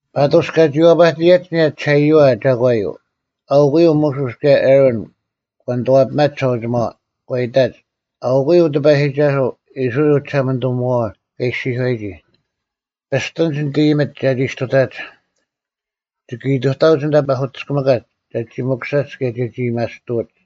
ᐸᑐᔅ ᑲᒋ ᐛᐸᑎᔭᒡ ᐊᓂᔭ ᒋᓴᐃᔪᐛ ᒐᒂᔪᐤ, ᐊᐅᑯᔪᐤ ᒧᓱᔅ ᑭᔭ ᐊᕋᓐ ᒂ ᓂᑐᐛᐱᒪᒡ ᒋᓴᐅᒋᒪᐛ᙮ ᒂ ᐃᑕᒡ, “ᐊᐅᑯᔪᐤ ᑎᐸᔨᒋᒐᓱᐤ, ᐃᔅᕋᐃᓪ ᐅᒋᓴᒪᓂᑐᒧᐛᐛ ᑲ ᐃᔅᒋᔄᔨᒋ, ‘ᐱᔅᑎᓂᒡ ᓂᑦ ᐃᔨᒥᒡ ᒐᒋ ᔅᑐᑕᒡ, ᒋᑭ ᐃᑐᑕᐅᒡ ᐊᓐᑕ ᐸᐧᑯᑎᔅᑭᒥᑲᒡ ᒐᒋ ᒥᑯᓴᒡ ᑭᔭ ᒐᒋ ᐊᔭᒥᐊᔅᑐᐅᒡ᙮’”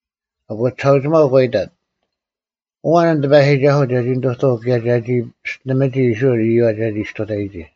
ᐊᑯ ᒋᓴᐅᒋᒪᐤ ᒂ ᐃᑕᑦ, “ᐊᐛᓐ ᐊᓐ ᑎᐸᔨᒋᒐᓱᐤ ᒐᒋ ᓂᑐᑐᐅᒄ ᑭᔭ ᒐᒋ ᐱᔅᑎᓂᒥᒋ ᐃᔅᕋᐃᓪ ᐃᔪᐛ ᒐᒋ ᔅᑐᑕᔨᒋ?”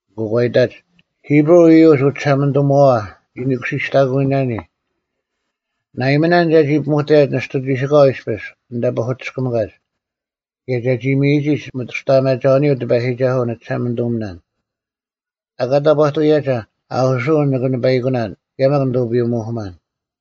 ᐊᑯ ᒂ ᐃᑕᒡ, “ᐃᑉᕈᐤ ᐃᔪᒡ ᐅᒋᓴᒪᓂᑐᒧᐛᐛ ᓂᒋ ᓄᑯᓯᔅᑕᑯᐱᓇᓂ, ᓇᐃᒥᓇᓐ ᒐᒋ ᐱᒧᑕᔭᒡ ᓂᔅᑐ ᒋᓯᑲᐛ ᐃᔅᐱᔅ ᐊᓐᑕ ᐸᐧᑯᑎᔅᑭᒥᑲᒡ, ᑭᔭ ᒐᒋ ᒥᔨᒋᒡ ᒥᑐᔅᑕᐊᒪᒐᐅᓂᔪᐤ ᑎᐸᔨᒋᒐᓱᐤ ᓂᒋᓴᒪᓂᑐᒥᓇᓐ, ᐊᑲ ᑕᑈᑐᔭᒐ ᐊᐧᑯᓱᐅᓐ ᓂᑭ ᓂᐸᐃᑯᓇᓐ ᑭᔭ ᒪᒃ ᓂᑐᐱᔪᐅ-ᒧᐧᑯᒪᓐ᙮”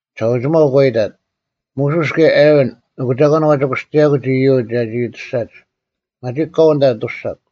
ᒋᓴᐅᒋᒪᐤ ᒂ ᐃᑕᑦ, “ᒧᓱᔅ ᑭᔭ ᐊᕋᓐ, ᐊᑯ ᒐᒂᓐ ᐛᒋ ᑯᔅᑎᔭᑯᒡ ᐃᔪᒡ ᒐᒋ ᐊᑐᔅᒐᒡ? ᒪᒋᒄ ᑲᐤ ᐊᓐᑕ ᐊᑐᔅᒐᒄ!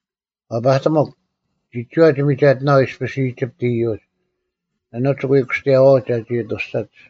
ᐛᐸᑎᒧᒄ! ᒋᒋᐛ ᒋ ᒥᒐᑎᓇᐛᐤ ᐃᔅᐱᔅ ᐃᒋᑉᑦ ᐃᔪᒡ᙮ ᐊᓄᒡ ᒋ ᐎ ᑯᔅᑎᔭᐛᐅᒡ ᒐᒋ ᐊᑐᔅᒐᒡ᙮”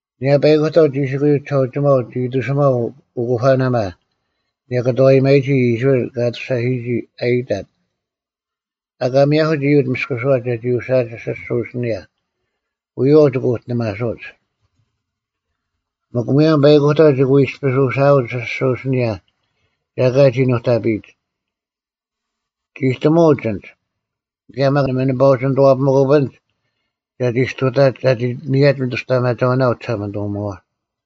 ᐊᓂᔭ ᐸᐃᑯᑕᐤ ᒋᓯᑯᔪᐤ ᒋᓴᐅᒋᒪᐤ ᒋ ᐃᑎᓱᒪᐤ ᐅᑯᐸᓇᒪ ᓂᔭᑭᑐᐛᔨᒪᔨᒋ ᐃᔅᕋᐃᓪ ᑲ ᐊᑐᔅᒐᓯᔨᒋ ᐊ ᐃᑕᑦ᙮ “ᐊᑲ ᒥᔭᐧᑯᒡ ᐃᔪᒡ ᒥᔅᑯᓱᐛ ᒐᒋ ᐅᓯᐊᒡ ᐊᓯᔅᒍᐤ ᐊᓯᓂᔭ᙮ ᐎᔪᐛᐤ ᒋᑭ ᐅᑎᓂᒪᓱᐅᒡ᙮ ᒥᒄ ᒧᔭᒻ ᐸᐃᑯᑕᐤ ᒋᑭ ᐎ ᐃᔅᐱᔅ ᐅᓯᐊᒡ ᐊᓯᔅᒍᐤ ᐊᓯᓂᔭ ᒐ ᐊᑲ ᒋ ᓄᑕᐱᔨᒡ᙮ ᒋᑎᒧᐅᒡ ᐊᓐᒡ, ᑭᔭ ᒪᒃ ᓇᒪ ᓂᐸ ᐅᒋ ᓂᑐᐛᔨᑎᒪᐧᑯᐱᓐᒡ ᒐᒋ ᔅᑐᑕᒡ ᒐᒋ ᒥᔭᒡ ᒥᑐᔅᑕᐊᒪᒐᐅᓇ ᐅᒋᓴᒪᓂᑐᒧᐛᐛ᙮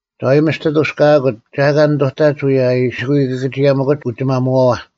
ᒐ ᐎ ᒥᔅᑎ ᐊᑐᔅᑲᑯᒡ ᒐ ᐊᑲ ᓂᑐᑕᒡ ᐅᔭ ᐊ ᐃᓯ ᐎ ᑭᑭᒋᔭᒥᑯᒡ ᐅᒋᒪᒧᐛᐛ᙮”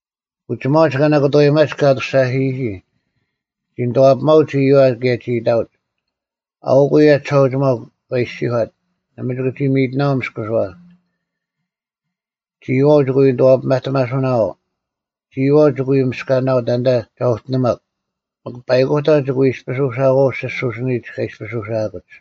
ᐅᒋᒪᐅᒡ ᑲ ᓇᑭᑐᐛᔨᒪᒡ ᑲ ᐊᑐᔅᒐᓯᔨᒋ ᒋ ᓂᑐᐛᐱᒪᐅᒡ ᐃᔪᐛ ᑭᔭ ᒋ ᐃᑕᐅᒡ᙮ “ᐊᐅᒃ ᐅᔭ ᒋᓴᐅᒋᒪᐤ ᑲ ᐃᔅᒋᔄᑦ, ‘ᓇᒪ ᒋᑭ ᒋ ᒥᔨᑎᓇᐛᐤ ᒥᔅᑯᓱᐛ᙮ ᒋᔨᐛᐤ ᒋᑭ ᐎ ᓂᑐᐛᐸᑎᒪᓱᓇᐛᐤ᙮ ᒋᔨᐛᐤ ᒋᑭ ᐎ ᒥᔅᑲᓇᐤ ᑕᓐᑕ ᒐ ᐅᑎᓂᒪᒄ᙮ ᒥᒄ ᐸᐃᑯᑕᐤ ᒋᑭ ᐎ ᐃᔅᐱᔅ ᐅᓯᐊᐅᒡ ᐊᓯᔅᒍᐤ ᐊᓯᓂᔨᒡ ᑲ ᐃᔅᐱᔅ ᐅᓯᐊᑯᒡ᙮’”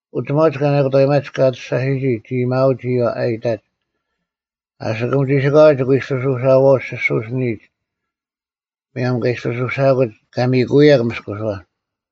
ᐅᒋᒪᐅᒡ ᑲ ᓇᑭᑐᐛᔨᒪᒡ ᑲ ᐊᑐᔅᒐᓯᔨᒋ ᒋ ᐃᔨᒧᐅᒡ ᐃᔪᐛ ᐊ ᐃᑕᒡ, “ᐊᓯᑯᒻ ᒋᓯᑲᐛ ᒋᑭ ᐎ ᐃᔅᐱᔅ ᐅᓴᐛᐅᒡ ᐊᓯᔅᒍᐤ ᐊᓯᓂᔨᒡ ᒧᔭᒻ ᑲ ᐃᔅᐱᔅ ᐅᓯᐊᑯᒡ ᑲ ᒥᔨᑯᐅᔭᒄ ᒥᔅᑯᓱᐛ᙮”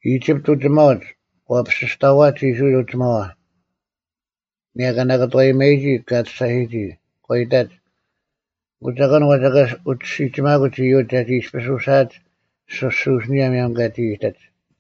ᐃᒋᑉᑦ ᐅᒋᒪᐅᒡ ᒂ ᐱᓯᔅᑕᐛᒡ ᐃᔅᕋᐃᓪ ᐅᒋᒪᐛ ᐊᓂᔭ ᑲ ᓇᑭᑐᐛᔨᒪᒋ ᑲ ᐊᑐᔅᒐᓯᔨᒋ᙮ ᒂ ᐃᑕᒡ, “ᐊᑯ ᒐᒂᓐ ᐛᒋ ᐊᑲ ᐅᒋ ᓯᒋᒪᑯᒡ ᐃᔪᒡ ᒐᒋ ᐃᔅᐱᔅ ᐅᓯᐊᒡ ᐊᓯᔅᒍᐤ ᐊᓯᓂᔭ ᒧᔭᒻ ᑲᒋ ᐃᑎᒡ?”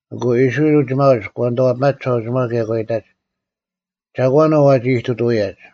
ᐊᑯ ᐃᔅᕋᐃᓪ ᐅᒋᒪᐅᒡ ᒂ ᓂᑐᐛᐱᒪᒡ ᒋᓴᐅᒋᒪᐛ ᑭᔭ ᒂ ᐃᑕᒡ, “ᒐᒂᓐ ᐅ ᐛᒋ ᐃᑐᑐᐅᔭᒡ?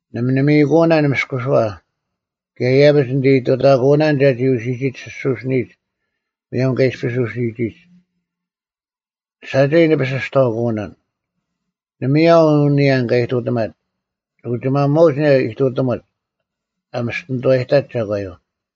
ᓇᒪ ᓂ ᒥᔨᑯᐅᓇᓐ ᒥᔅᑯᓱᐛ, ᑭᔭ ᐃᔭᐱᒡ ᓂᑦ ᐃᑐᑕᑯᐅᓇᓐ ᒐᒋ ᐅᓯᔨᒋᒡ ᐊᓯᔅᒍᐤ ᐊᓯᓂᔨᒡ ᒧᔭᒻ ᑲᒋ ᐃᔅᐱᔅ ᐅᓯᔨᒋᒡ᙮ ᓴᒐᔾ ᓂ ᐱᓯᔅᑕᐅᑯᓇᓐ, ᓇᒪᔭᐤ ᐅ ᓂᔭᓐ ᑲ ᐃᑐᑎᒪᒡ᙮ ᒋᐅᒋᒪᒧᐛᐅᒡ ᐊᓂᔭ ᐃᑐᑎᒧᒡ ᐊ ᒥᔅᑎᓂᑐᐛᔨᑕᒡ ᒐᒂᔪᐤ᙮”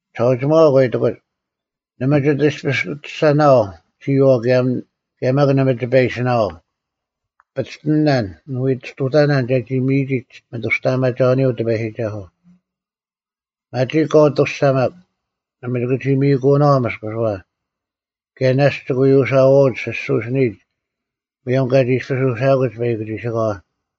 ᒋᓴᐅᒋᒪᐛ ᒂ ᐃᑎᑯᒡ, “ᓇᒪ ᒋᑦ ᐃᔅᐱᔅ ᐊᑐᔅᒐᓇᐛᐤ ᒋᔨᐛᐤ ᑭᔭ ᒪᒃ ᓇᒪ ᒋᐸ ᐃᓯᓇᐤ, ‘ᐱᔅᑎᓇᓐ, ᓂ ᐎ ᔅᑐᑕᓇᓐ ᒐᒋ ᒥᔨᒋᒡ ᒥᑐᔅᑕᐊᒪᒐᐅᓂᔪᐤ ᑎᐸᔨᒋᒐᓱᐤ᙮’ ᒪᒋᒄ ᑲᐤ ᐊᑐᔅᒐᒪᒃ᙮ ᓇᒪ ᒋᑭ ᒋ ᒥᔨᑯᐅᓇᐛᐤ ᒥᔅᑯᓱᐛ, ᑭᔭ ᓇᔅᒡ ᒋᑭ ᐎ ᐅᓴᐛᐅᒡ ᐊᓯᔅᒍᐤ ᐊᓯᓂᔨᒡ ᒧᔭᒻ ᑲᒋ ᐃᔅᐱᔅ ᐅᓯᐊᑯᒡ ᐸᐃᑯᒋᓯᑲᐛ!”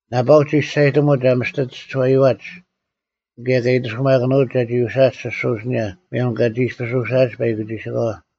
ᓇᐸᐅᒡ ᒋᔅᒐᔨᑎᒧᒡ ᐊ ᒥᔅᑎ ᒋᔄᐃᐛᒡ ᑭᔭ ᑲ ᐃᑎᓱᒪᑭᓄᐅᒡ ᒐᒋ ᐅᓯᐊᒡ ᐊᓯᔅᒍᐤ ᐊᓯᓂᔭ ᒧᔭᒻ ᑲᒋ ᐃᔅᐱᔅ ᐅᓯᐊᒡ ᐸᐃᑯᒋᓯᑲᐛ᙮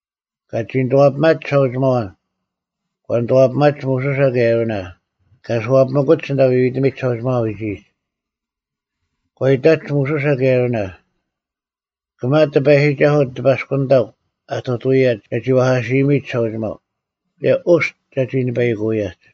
ᑲᒋ ᓂᑐᐛᐱᒪᒡ ᒋᓴᐅᒋᒪᐛ᙮ ᒂ ᓂᑐᐛᐱᒪᒡ ᒧᓱᓴ ᑭᔭ ᐊᕋᓇ, ᑲ ᐊᓱᐛᐱᒥᑯᒡ ᐊᓐᑕ ᐎᐎᑎᒥᒡ ᒋᓴᐅᒋᒪᐛ ᐎᒋᔨᒡ᙮ ᒂ ᐃᑕᒡ ᒧᓱᓴ ᑭᔭ ᐊᕋᓇ, “ᑭᒪ ᑎᐸᔨᒋᒐᓱᐤ ᑎᐸᔅᑯᓂᑕᒄ ᐊᑐᑐᐅᔭᒡ ᒐᒋ ᐛᐧᑲᓯᔨᒥᑦ ᒋᓴᐅᒋᒪᐤ, ᑭᔭ ᐅᔅᑦ ᒐᒋ ᓂᐸᐃᑯᐅᔭᒡ᙮”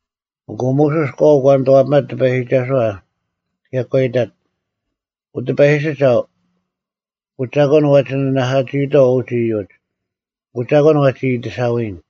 ᐊᑯ ᒧᓱᔅ ᑲᐤ ᒂ ᓂᑐᐛᐱᒪᑦ ᑎᐸᔨᒋᒐᓱᐛ ᑭᔭ ᒂ ᐃᑕᑦ, “ᐅᑎᐸᔨᒋᒐᐤ, ᐊᑯ ᒐᒂᓐ ᐛᒋ ᓂᓇᐧᑲᒋᐃᑥᐤ ᐅᒡ ᐃᔪᒡ? ᐊᑯ ᒐᒂᓐ ᐛᒋ ᐃᑎᓴᐎᓐ?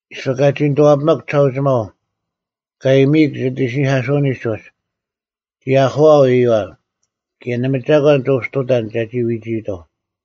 ᐃᔅᐱ ᑲᒋ ᓂᑐᐛᐱᒥᒃ ᒋᓴᐅᒋᒪᐤ, ᑲ ᐃᔨᒥᐃᒃ ᒋᑦ ᐃᓯᓂᐧᑲᓱᐅᓂᒡ ᐅᒡ, ᒋ ᐊᐧᑯᐊᐤ ᐃᔪᐛ᙮ ᑭᔭ ᓇᒪ ᒐᒂᓐ ᒋ ᐅᒋ ᑐᑕᓐ ᒐᒋ ᐎᒋᐃᑥᐤ᙮”